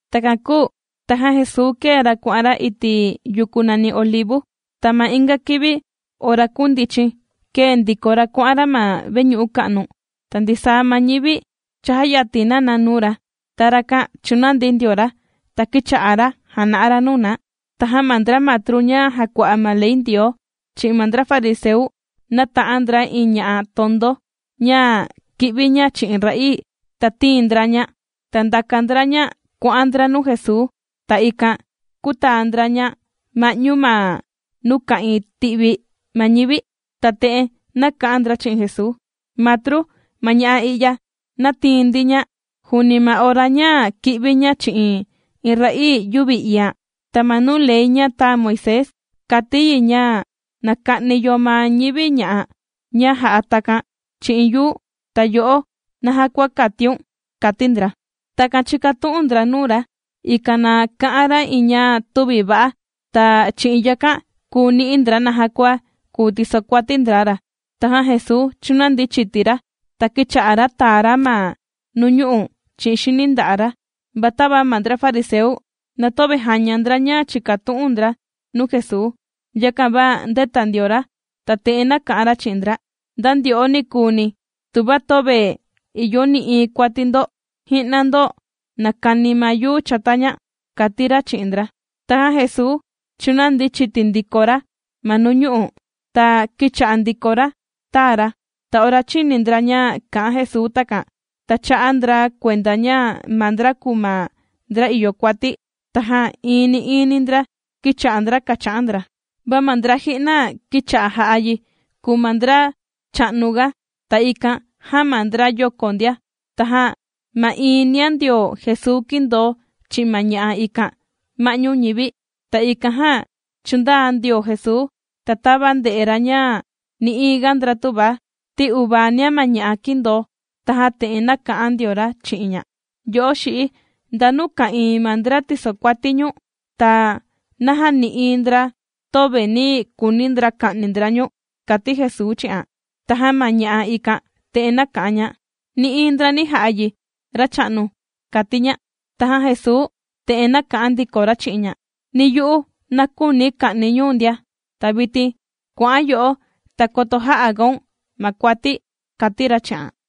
Takan kūu tajan Jesuu kēe ra kuà'an ra iti' yuku nàni Olivu. Ta ma inga kivi ora kūndichin, kēe ndiko ra kuà'an ra ma veñu'u ka'nu, ta ndisaa ma ñivi chājayatin na na nuu ra, ta rakan chūnandi ndio ra, ta kīcha'a ra jàna'a ra nuu na. Tajan ma ndra matru ña jàkua'a ma ley Ndioo, chi'in ma ndra fariseu nāta'an ndra iin ña'a tondo ña kì'vi ña chi'in ra'ii, ta tīin ndra ña, ta ndàka ndra ña kuà'an ndra nuu Jesuu. Ta ikan kūtaa ndra ña ma'ñu ma nuu ka'ìin ti'vi ma ñivi, ta te'en nāka'an ndra chi'in Jesuu: ―Matru, ma ña'a i'ya nātiin ndi ña, juuni ma ora ña kì'vi ña chi'in iin ra'ii yüvi iian. Ta ma nuu ley ña tāa Moisés, kàti yi ña na ka'ni yo ma ñivi ña'a ña jà'a takan chi'in yuu. Ta yo'o, ¿naja kua kàtiun? ―kàti ndra. Takan chīkatu'un ndra nuu ra, ikan na ka'an ra iin ña tüvi va'a, ta chi'in yakan kùu ni'i ndra naja kua kùu tisokuati ndra ra. Tajan Jesuu chūnandi chiti ra, ta kīcha'a ra tàa ra ma nuu ñu'u' chi'in xini nda'a' ra. Va tava ma ndra fariseu na töve jàña ndra ña chìkatu'un ndra nuu Jesuu, yakan va ndēta ndio ra, ta te'en nāka'an ra chi'in ndra: ―Nda ndyo'o nikuuni, tuva töve ìyo nï'iin kuati ndo, ji'na ndo na kani ma yuu chata ña ―kàti ra chi'in ndra. Tajan Jesuu chūnandi chiti ndiko ra ma nuu ñu'u', ta kīcha'a ndiko ra tàa ra. Ta ora chīni ndra ña kā'an Jesuu takan, ta chā'a ndra kuenda ña maa ndra kùu ma ndra ìyo kuati, tajan iini iini ndra kīcha'a ndra kàcha'an ndra, va ma ndra ji'na kīcha'a jà'a yi kùu ma ndra cha'nuga, ta ikan jan, ma ndra yoko ndia. Tajan ma'iin nia ndio Jesuu kīndoo chi'in ma ña'a ikan ma'ñu ñivi. Ta ikan jan, chūndaa ndio Jesuu, ta tava ndē'e ra ña nï'iin ga ndra tüva, ti uvaa nia ma ña'a kīndoo, tajan te'en nāka'an ndio ra chi'in ña: ―Yo'o xi'i, ¿ndanu ka'ìin ma ndra tīsokuati ñu̱n? Ta, ¿naja nï'iin ndra, töve nī kuuni ndra ka'ni ndra ñu̱n? ―kàti Jesuu chi'an. Tajan ma ña'a ikan te'en nāka'an ña: ―Nï'iin ndra nī ja'a yi racha'nu ―kàti ña. Tajan Jesuu te'en nāka'an ndiko ra chi'in ña: ―Ni yu'u na küuni̱ ka'ni̱ ñu̱n ndia. Ta vitin kuà'an yo'o, ta koto jä'a gaun ma kuati ―kàti ra chi'an.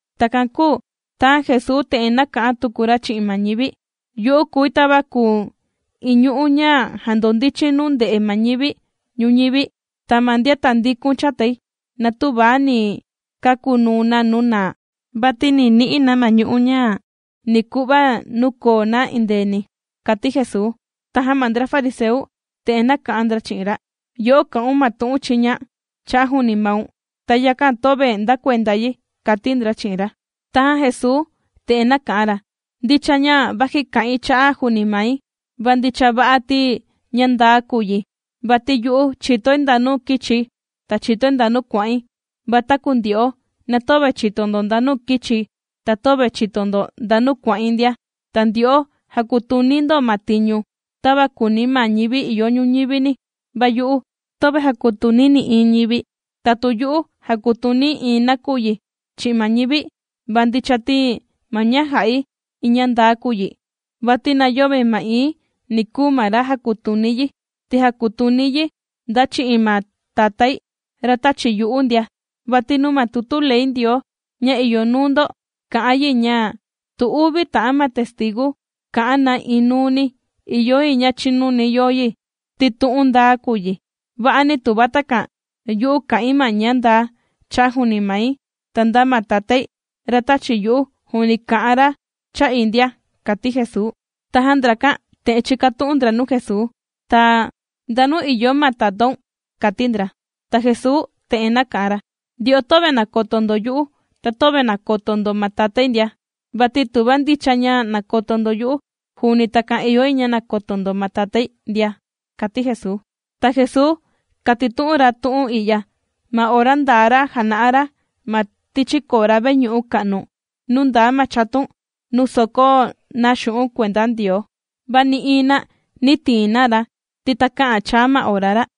Takan kūu tajan Jesuu te'en nāka'an tuku ra chi'in ma ñivi: ―Yu'u kùi tava kùu iin ñu'ú ña jàndondichin nuu ndè'e ma ñivi ñuñivi, ta ma ndian tàndikun chatai, na töva ni kakunuu na nuu naa, vati ni ni'i na ma ñu'ú ña ni ku'va nuu koo na endeeni ―kàti Jesuu. Tajan ma ndra fariseu te'en nāka'an ndra chi'in ra: ―Yo'o, kà'un ma tu'un chiña cha'a' juuni maun, ta yakan töve nda kuenda yi ―kàti ndra chi'in ra. Tajan Jesuu te'en nāka'an ra: ―Ndicha ña vaji kà'in cha'a juuni mai, va ndicha va'a ti ña ndaa kùu yi. Vati yu'u chìtoi ndanu kīchi̱, ta chìtoi ndanu kuà'in. Va taku ndyo'o, na töve chìto ndo ndanu kīchi̱, ta töve chìto ndo ndanu kuà'in ndia. Ta ndyo'o jàkutuni ndo ma tiñu, tava kùuni ma ñivi ìyo ñuñivini, va yu'u töve jàkutuni̱ nï'iin ñivi. Ta tu yu'u jàkutuni̱ iin nakuyi chi'in ma ñivi, va ndicha ti ma ña jà'i, iin ña ndaa kùu yi, vati na yöve ma'iin ni kùu ma ra jàkutuni yi, ti jàkutuni̱ yi nda chi'in ma Tatái, ra tāchi yu'u ndia. Vati nuu ma tutu ley Ndioo ña ìyo nuu ndo kà'an yi, ña tu uvi ta'an ma testigu kà'an na iin nuu ni, ìyo yi ña chinuni yo yi, ti tu'un ndaa kùu yi. Va'ani tuva takan, yu'u kà'in ma ña ndaa cha'a' juuni mai, ta nda ma Tatái, ra tāchi yu'u, juuni kà'an ra cha'i ndia ―kàti Jesuu. Tajan ndrakan te'en chīkatu'un ndra nuu Jesuu: ―Ta, ¿ndanu ìyo ma tatáun? ―kàti ndra. Ta Jesuu te'en nāka'an ra: ―Ndyo'o, töve nàkoto ndo yu'u, ta töve nàkoto ndo ma Tatái ndia. Vati tuva ndicha ña nàkoto ndo yu'u, juuni takan ìyo yi ña nakoto ndo ma Tatái ndia ―kàti Jesuu. Ta Jesuu kātitu'un ra ma tu'un i'ya, ma ora ndaa ra jàna'a ra ma tichi kora veñu'u ka'nu, nuu ndaa ma chatun, nuu sòkó na xu'un' kuenda Ndioo. Va nï'iin na nī tiin na ra, ti takä'an chaa ma ora ra.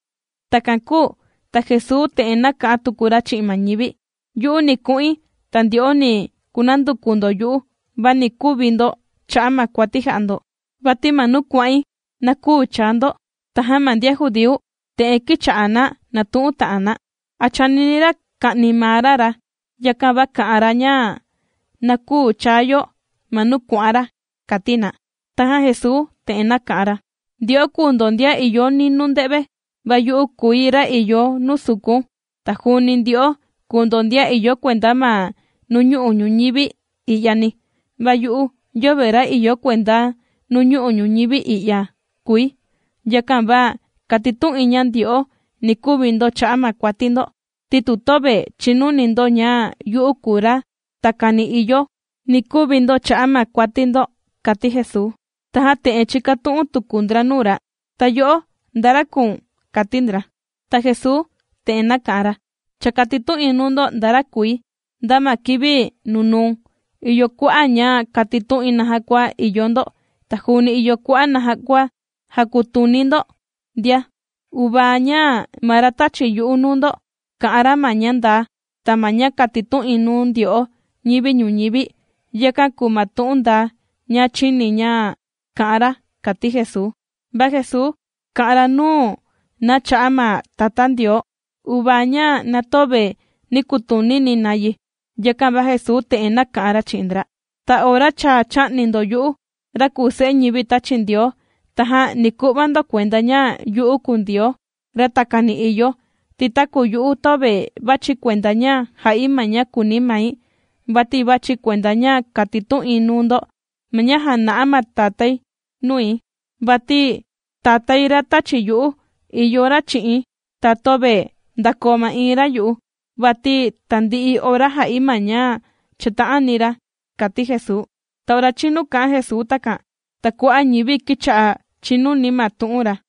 Takan kūu ta Jesuu te'en nāka'an tuku ra chi'in ma ñivi: ―Yu'u ni ku'in, ta ndyo'o ni kunanduku ndo yu'u, va ni kuvi ndo cha'a' ma kuati jà'a ndo, vati ma nuu kuà'in, na küu chaa ndo. Tajan ma ndian judíu te'en kīcha'a na nàtu'un ta'an na: ―¿A chànini ra ka'ni maa ra ra, yakan va kà'an ra, ña na küu chaa yo ma nuu kuà'an ra? ―kàti na. Tajan Jesuu te'en nāka'an ra: ―Ndyo'o kùu ndo ndian ìyo ninuu nde've, va yu'u kùi, ra ìyo nuu sukun. Ta juuni ndyo'o kùu ndo ndian ìyo kuenda ma nuu ñu'u' ñuñivi i'yani, va yu'u yöve ra ìyo kuenda nuu ñu'u' ñuñivi i'ya kùi. Yakan va kātitu'in ña ndyo'o ni kuvi ndo cha'a' ma kuati ndo, ti tu töve chìnuni ndo ña yu'u kùu ra takani ìyo ―kàti Jesuu. Tajan te'en chīkatu'un tuku ndra nuu ra: ―Ta yo'o, ¿nda ra kùu̱n? ―kàti ndra. Ta Jesuu te'en nāka'an ra: ―Cha kātitu'in nuu ndo nda ra kùi, nda ma kivi nunuu. Ìyo kua'a' ña kàtitu'in naja kua ìyo ndo, ta juuni ìyo kua'a' naja kua jàkutuni̱ ndo ndia, uvaa ña ma ra tāchi yu'u nuu ndo, kà'an ra ma ña ndaa, ta ma ña kàtitu'in nuu ndyo'o ñivi ñuñivi, yakan kùu ma tu'un ndaa ña chīni̱ ña kā'an ra ―kàti Jesuu. Va Jesuu kà'an ra nuu na cha'a' ma Tatá Ndioo, uvaa ña na töve nī kutunini na yi. Yakan va Jesuu te'en nāka'an ra chi'in ndra: ―Ta ora cha chā'ni ndo yu'u, ra kùu Se'e ñivi tāchi Ndioo, tajan ni ku'va ndo kuenda, ña yu'u kùu Ndioo, ra takani ìyo, ti taku yu'u töve vàchi̱ kuenda ña jà'i ma ña kùuni mai, vati vàchi̱, kuenda ña kàtitu'in nuu ndo ma ña jāna'a ma Tatáini nui. Vati Tatái ra tāchi yu'u, ìyo ra chi'i̱n, ta töve ndàkoo ma'iin ra yu'u, vati tandi'i ora jà'i ma ña chàta'ani ra ―kàti Jesuu. Ta ora chīnu kā'an Jesuu takan, ta kua'a' ñivi kīcha'a chìnuni ma tu'un ra.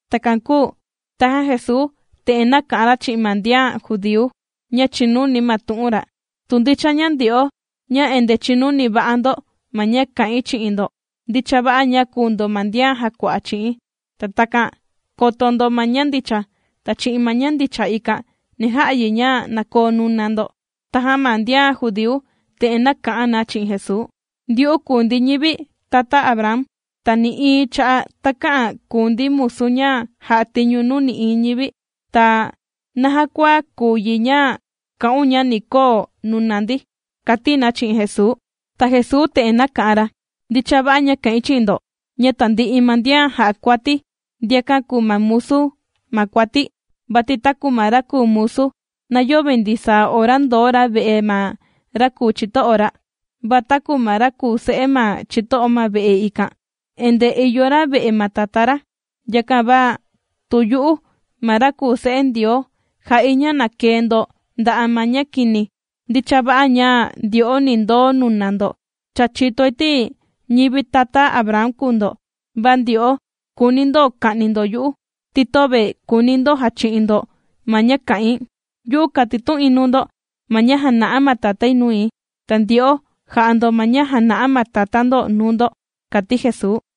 Takan kūu tajan Jesuu te'en nāka'an ra chi'in ma ndian judíu, ña chīnuni ma tu'un ra: ―Tu ndicha ña ndyo'o, ña endee chìnuni va'a ndo ma ña kà'in chi'in ndo, ndicha va'a ña kùu ndo ma ndian jàkua'a chi'i̱n. Ta takan koto ndo ma ña ndicha, ta chi'in ma ña ndicha ikan ni ja'a yi ña na koo nuna ndo. Tajan ma ndian judíu te'en nāka'an na chi'in Jesuu: ―Ndyu'u kùu ndi ñivi tata Abraham, ta nï'iin cha'a' takä'an kùu ndi musu ña jà'a tiñu nuu nï'iin ñivi. Ta, ¿naja kua kùu yi ña kà'un, ña ni koo nuna ndi? ―kàti na chi'in Jesuu. Ta Jesuu te'en nāka'an ra: ―Ndicha va'a ña kà'in chi'in ndo, ña tandi'i ma ndian jà'a kuati, ndiakan kùu na musu ma kuati. Vati taku ma ra kùu musu, na yöve ndisaa ora ndoo ra ve'e ma ra kùu chito'o ra, va taku ma ra kùu se'e ma chito'o ma ve'e ikan, endee ìyo ra ve'e ma tatá ra. Yakan va tu yu'u ma ra kùu se'e Ndioo jà'i ña na kee ndo nda'a' ma ña kini, ndicha va'a ña ndyo'o, ni ndoo nuna ndo. Cha chìtoi ti ñivi tata Abraham kùu ndo, va ndyo'o kùuni ndo ka'ni ndo yu'u, ti töve kùuni ndo jachi'in ndo ma ña kà'in. Yu'u kàtitu'in nuu ndo ma ña jàna'a ma Tatái nui, ta ndyo'o jà'a ndo ma ña jàna'a ma tatá ndo nuu ndo ―kàti Jesuu.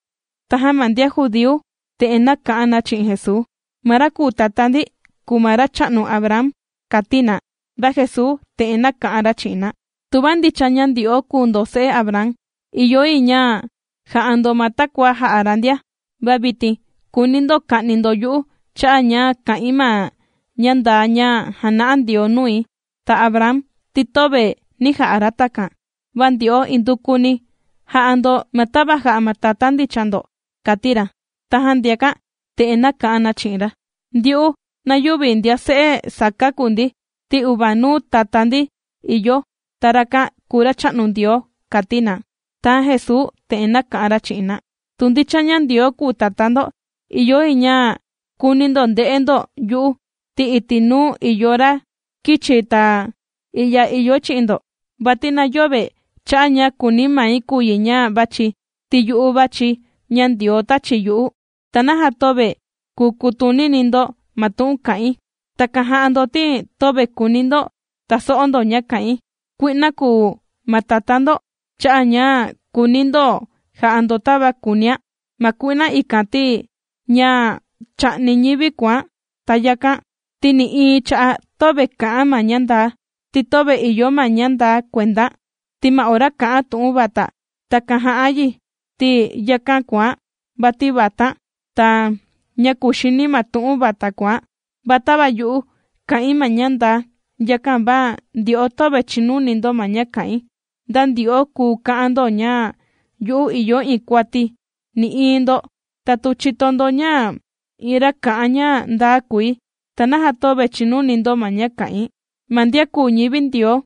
Tajan ma ndian judíu te'en nāka'an na chi'in Jesuu: ―Ma ra kùu tatá ndi, kùu ma racha'nu Abraham ―kàti na. Va Jesuu te'en nāka'an ra chi'in na: ―Tuva ndicha ña ndyo'o kùu ndo se'e Abraham, ìyo yi ña ja'a ndo ma takua jā'a ra ndia. Va vitin kùuni ndo ka'ni ndo yu'u cha'a' ña kà'in ma ña ndaa ña jàna'a Ndioo nui. Ta Abraham ti töve nī ja'a ra takan. Va ndyo'o indukuni jà'a ndo, ma tava jà'a ma tatá ndicha ndo ―kàti ra. Tajan ndiakan te'en nāka'an na chi'in ra: ―Ndyu'u, na yüvi ndian se'e saká kùu ndi, ti uvanuu tatá ndi ìyo, ta rakan kùu Racha'nu Ndioo ―kàti na. Tajan Jesuu te'en nāka'an ra chi'in na: ―Tu ndicha ña Ndioo kùu Tatá ndo, ìyo yi ña kuuni ndo nde'e ndo yu'u, ti iti' nuu ìyo ra kīchi̱, ta i'ya ìyoi chi'in ndo. Vati na yöve cha'a' ña kùuni mai kùu yi ña vàchi̱, ti yu'u vàchi̱ ña Ndioo tāchi yu'u. ¿Ta naja töve kùu kutunini ndo ma tu'un kà'in? Takan jà'a ndo, ti töve kùuni ndo taso'o ndo ña kà'in. Kui'na kùu ma tatá ndo, cha'a' ña kùuni ndo ja'a ndo tava kùunián'. Ma kui'na ikan, ti ñá' chà'ni ñivi kùán'. Ta yakán' ti, nï'iin cha'a' töve kà'án' ma ña ndaa, ti töve ìyo ma ña ndaa kuendán'. Ta ma ora kà'án' tu'un vata, takan jà'án' yi, ti yakán' kùán', vati vatán', ta ñá' kuxini ma tu'un vata kùán'. Va tava yu'u, kà'in ma ña ndaa, yakan va ndyo'o töve chìnuni ndo ma ña kà'in. ¿Nda ndyo'o kùu ka'an ndo, ña yu'u ìyo iin kuati̱? Nï'iin ndo. Ta tu chìto ndo ña iin ra kà'an ña ndaa kùi, ¿ta naja töve chìnuni ndo ma ña kà'in? Ma ndian kùu ñivi Ndioo,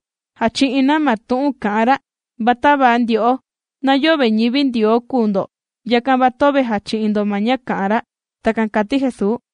jàchi'in na ma tu'un kà'an ra. Va tava ndyo'o, na yöve ñivi Ndioo kùu ndo, yakan va töve jàchi'in ndo ma ña kà'an ra. ―Takan kàti Jesuu.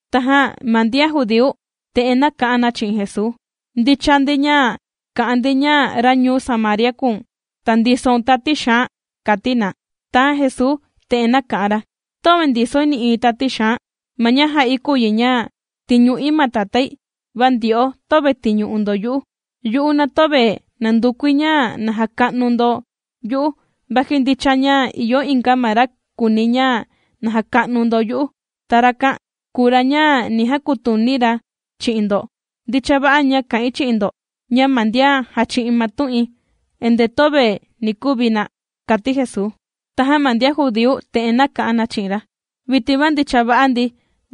Tajan ma ndian judíu te'en nāka'an na chi'in Jesuu: ―Ndicha ndi ña kà'an ndi, ña ra ñuu Samaria kùu̱n, ta ndisoun tati xaan ―kàti na. Tajan Jesuu te'en nāka'an ra: ―Töve ndisoi nï'iin tati xaan. Ma ña jà'i kùu yi ña tìñu'i ma Tatái, va ndyo'o töve tìñu'u ndo yu'u. Yu'u, na töve nàndukui ña na jaka'nu ndo yu'u, vaji ndicha ña ìyo inga ma ra kùuni ña na jaka'nu ndo yu'u, ta rakan kùu ra ña ni jakutuni ra chi'in ndo. Ndicha va'a ña kà'in chi'in ndo, ña ma ndian jàchi'in ma tu'in, endee töve ni kuvi na ―kàti Jesuu. Tajan ma ndian judíu te'en nāka'an na chi'in ra: ―Vitin va ndicha va'a ndi,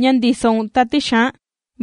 ña ndisoun tati xaan.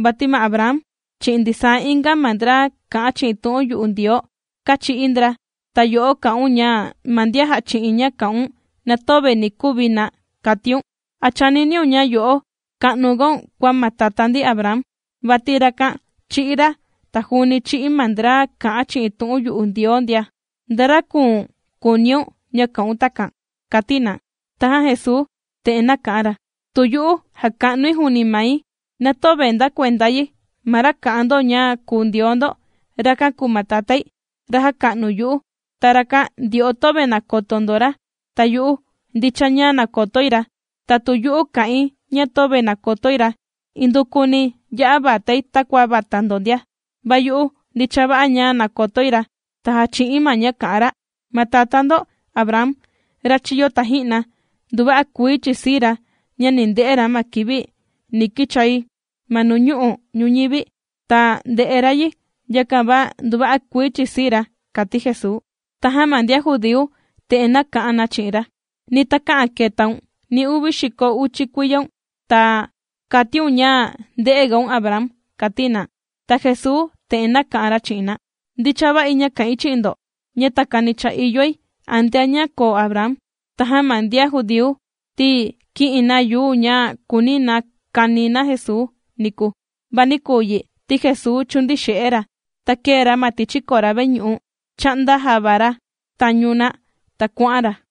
Vati ma Abraham, chi'in ndisaa inga ma ndra kà'an chi'in tu'un yu'u Ndioo, kāchi'í ndra, ta yo'o kà'un ña, ma ndian jàchi'in ña kà'un, na töve ni kuvi na, kàtiun. ¿A chàniniun ña yo'o ka'nugaun kua ma tatá ndi Abraham? Vati rakan chī'í ra, ta juuni chī'í ma ndra kà'an chi'in tu'un yu'u Ndioo ndia. ¿Nda ra kùu̱n kùuniun, ña kà'un takan? ―kàti na. Tajan Jesuu te'en nāka'an ra: ―Tu yu'u jàka'nui juuni mai, na töve nda kuenda yi. Ma ra kà'an ndo ña kùu Ndioo ndo, rakan kùu ma Tatái, ra jàka'nu yu'u. Ta rakan, ndyo'o töve nàkoto ndo ra. Ta yu'u, ndicha ña nàkotoi ra. Ta tu yu'u kà'in ña töve nàkotoi ra, indukuni ya'a vatai takua vata ndo ndia. Va yu'u, ndicha va'a ña nàkotoi ra, ta jàchi'i̱n ma ña kà'an ra. Ma tatá ndo Abraham, ra chīyo taji'na, nduva'a kuii chīsii ra, ña ni nde'e ra ma kivi ni kichai ma nuñu'u' ñuñivi, ta ndē'e ra yi. Yakan va nduva'a kuii chīsii ra ―kàti Jesuu. Tajan ma ndian judíu te'en nāka'an na chi'in ra: ―Ni takä'an ketaun, ni uvi xiko uchi kuiyaun, ta kàtiun ña ndē'egaun Abraham ―kàti na. Ta Jesuu te'en nāka'an ra chi'in na: ―Ndicha va'i ña kà'in chi'in ndo, ña takani cha ìyoi, antea ña koo Abraham. Tajan ma ndian judíu ti, kī'in na yuu ña kūuni na kani na Jesuu niku. Va nī kuu yi, ti Jesuu chūndii xe'e ra, ta kēe ra ma tichi kora veñu'u, chā'nda java ra tañu na, ta kuà'an ra.